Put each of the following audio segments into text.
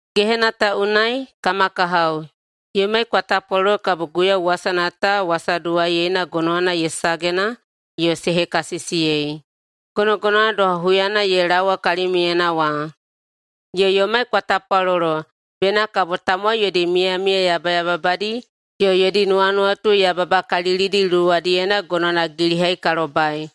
Gehena ta unai, kama kahao, yomai kwa tapwalolo kabo Guiyau wasana ta wasaduwaiyeina gonowana ye sagena yo se hekasisiyei, gonogonowana doha huyana ye laowa kalimiuyena wa. Yo yomai kwa tapwalolo bena kabo tamowai yodi miyamiya yabayababadi yo yodi nuwanuwatu yababakalilidi luwadiyena gonowana gilihai ka lobai,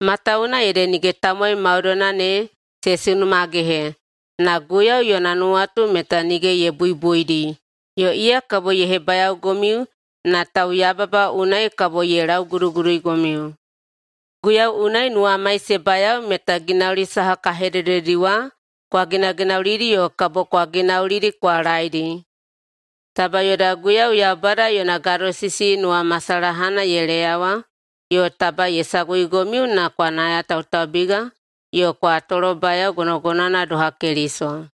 matawuwuna ede nige tamowai maudoina ne se sunumagehe. Na Guiyau yona nuwatu meta nige ye buibuidi yo iya kabo ye hebayaogomiu na tauyababa unai kabo ye lauguduguduigomiu. Guiyau unai nuwamai se bayao meta ginauli saha ka hedededi wa kwa ginaginaulidi yo kabo kwa ginaulidi kwa laeidi. Taba yoda Guiyau Yaubada yona gadosisi nuwamasalahana ye leyawa yo taba ye saguigomiu na kwa nayatautaubiga yo kwa tolobayao gonogonowana doha Keliso.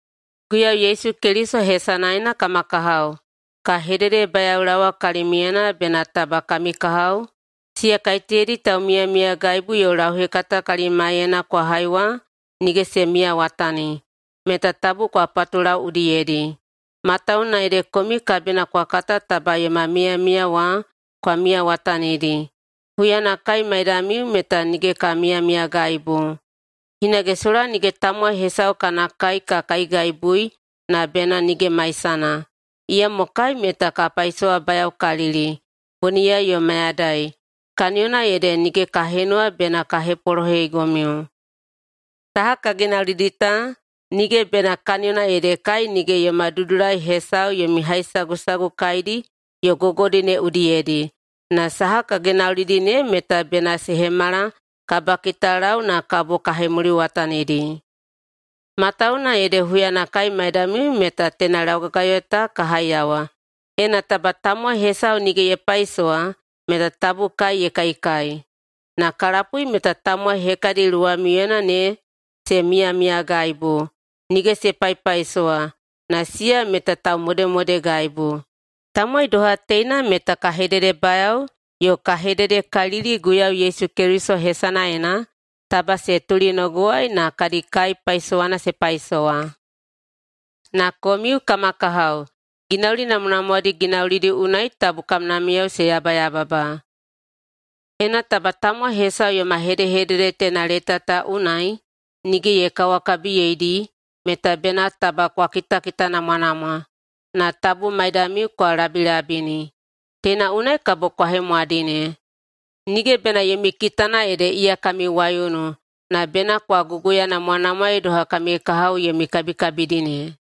Guiyau Yesu Keliso hesanaena, kama kahao, ka hededebayaolaowa kalimiuyena bena taba kami kahao, siya kaiteyadi taumiyamiyagaibu yo lauhekata kalimaiyena kwa hai wa nige se miyawatani, meta tabu kwa patulau udiyedi. Matawuwuna ede komiu kabina kwa kata taba yoma miyamiya wa kwa miyawatanidi. Huyana kai maidamiu meta nige ka miyamiyagaibu. Hinage sola nige tamowai hesau kana kai ka kaigaibui na bena nige maisana. Iyamo kai meta ka paisowabayaokalili boniyai yo mayadai, kaniyona ede nige ka henuwa bena ka hepolohegomiu. Saha ka ginaulidi ta, nige bena kaniyona ede kai nige yoma dudulai hesau yomi haisagusagu kaidi yo gogodi ne udiyedi, na saha ka ginaulidi ne meta bena se hemala kabakitalau na kabo kwa hemuliwatanidi. Matawuwuna ede huyana kai maidamiu meta teina laugagayo ta ka haiyawa, “Ena taba tamowai hesau nige ye paisowa meta tabu kai ye kaikai.” Ka lapui meta tamowai hekadi luwamiuyena ne se miyamiyagaibu, nige se paipaisowa, na siya meta taumodemodegaibu. Tamowai doha teina meta ka hededebayao yo ka hededekalili Guiyau Yesu Keliso hesanaena, taba se tulinogowai na kadi kai paisowana se paisowa. Na komiu, kama kahao, ginauli namwanamwadi ginaulidi unai tabu kamnamiyao se yabayababa. Ena taba tamowai hesau yoma hedehedede teina leta ta unai nige ye kawakabiyeidi meta bena taba kwa kitakitanamwanamwa, na tabu maidamiu kwa labilabini. Teina unai kabo kwa hemwadine. Nige bena yomi kitana ede iya kami waiunu, na bena kwa guguyanamwanamwaei doha kami kahao yomi kabikabidi ne.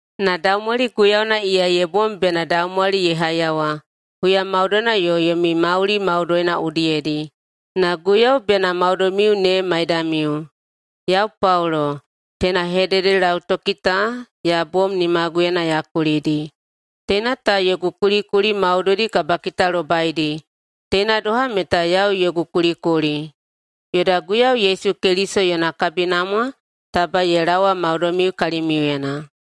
Na daumwali Guiyauna iya ye bom bena daumwali ye haiyawa huya maudoina yo yomi mauli maudoina udiyedi, na Guiyau bena maudoimiu ne maidamiu. Yau, Paulo, teina hededelautoki ta ya bom nimaguyena ya kulidi. Teina ta yogu kulikuli maudoidi kabakitalobaidi, teina doha meta yau yogu kulikuli. Yoda Guiyau Yesu Keliso yona kabinamwa taba ye laowa maudoimiu kalimiuyena.